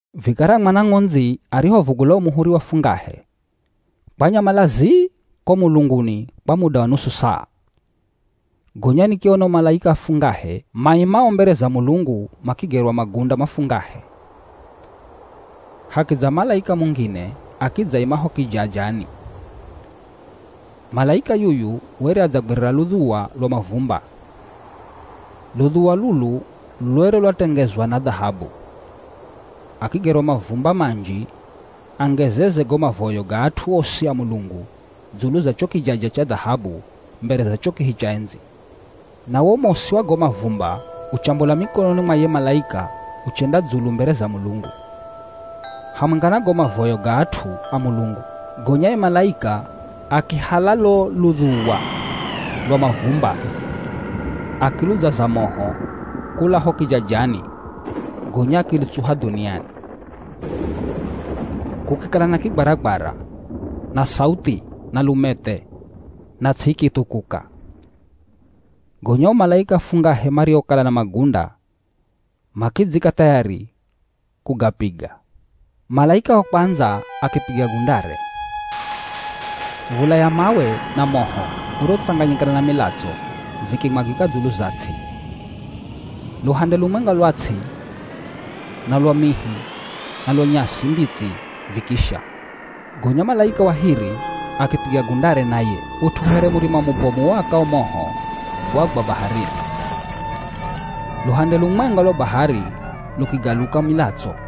Vikara Mwana Ng'ondzi arihovugula wo muhuri wa fungahe, kwanyamala zii ko mulunguni kwa muda wa nusu saa. Gonya nikiona o malaika afungahe maimao mbere za Mulungu makigerwa magunda mafungahe. Hakidza malaika mungine akidzaima ho kijajani. Malaika yuyu were adzagwirira ludhuwa lwa mavumba. Ludhuwa lulu lwere lwatengezwa na dhahabu. Akigerwa mavumba manji angezeze go mavoyo ga at'u osi a Mulungu dzulu za cho kijaja cha dhahabu mbere za cho kihi cha endzi. Na wo mosi wa go mavumba uchambola mikononi mwa ye malaika uchenda dzulu mbere za Mulungu, hamwenga na go mavoyo ga at'u a Mulungu. Gonya ye malaika akihala lo ludhuwa lwa mavumba, akiludzaza moho kula ho kijajani gonya akilutsuha dhuniani. Kukikala na kigwaragwara, na sauthi, na lumethe, na ts'i ikithukuka. Gonya o malaika afungahe mariokala na magunda makidzika thayari kugapiga. Malaika wa kwandza akipiga gundare. V̱ula ya mawe na moho urotsanganyikana na milatso vikimwagika dzulu za ts'i. Luhande lumwenga lwa ts'i, na lwa mihi, na lwa nyasi mbitsi vikisha. Gonya malaika wa hiri akipiga gundare naye. Ut'u here murima mubomu uakao moho wagwa baharini. Luhande lumwenga lwa bahari lukigaluka milatso.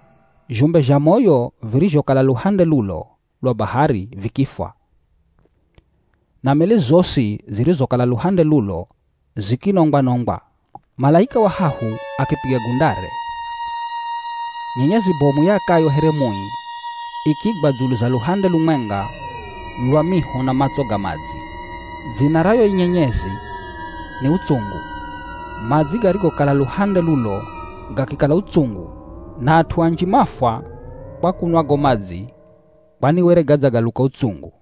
Zhumbe zha moyo virizhokala luhande lulo lwa bahari vikifwa. Na meli zosi zirizokala luhande lulo zikinongwa-nongwa. Malaika wa hahu akipiga gundare. Nyenyezi bomu iakayo here mui ikigwa dzulu za luhande lumwenga lwa miho na matso ga madzi. Dzina ra yo nyenyezi ni “Utsungu.” Madzi garigokala luhande lulo gakikala utsungu na at'u anji mafwa kwa kunwa go madzi kwani were gadzagaluka utsungu.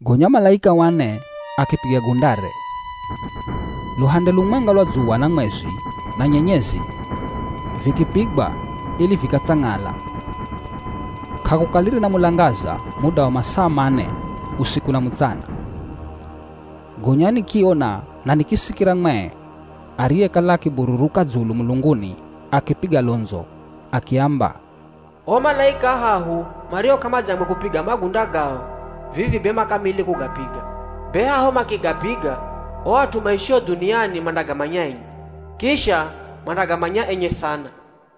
Gonya malaika wa ne akipiga gundare. Luhande lumwenga lwa dzuwa na mwezi na nyenyezi vikipigwa ili vikatsang'ala. K'akukalire na mulangaza muda wa masaa mane usiku na mutsana. Gonya nikiona na nikisikira mwee ariyekala akibururuka dzulu mulunguni akipiga londzo akiamba, “O malaika ahahu mario k'amadzangwe kupiga magunda gao vivi be makili kugapiga. Be haho makigapiga o at'u maishio dhuniani mandagamanya enye, kisha mandagamanya enye sana.”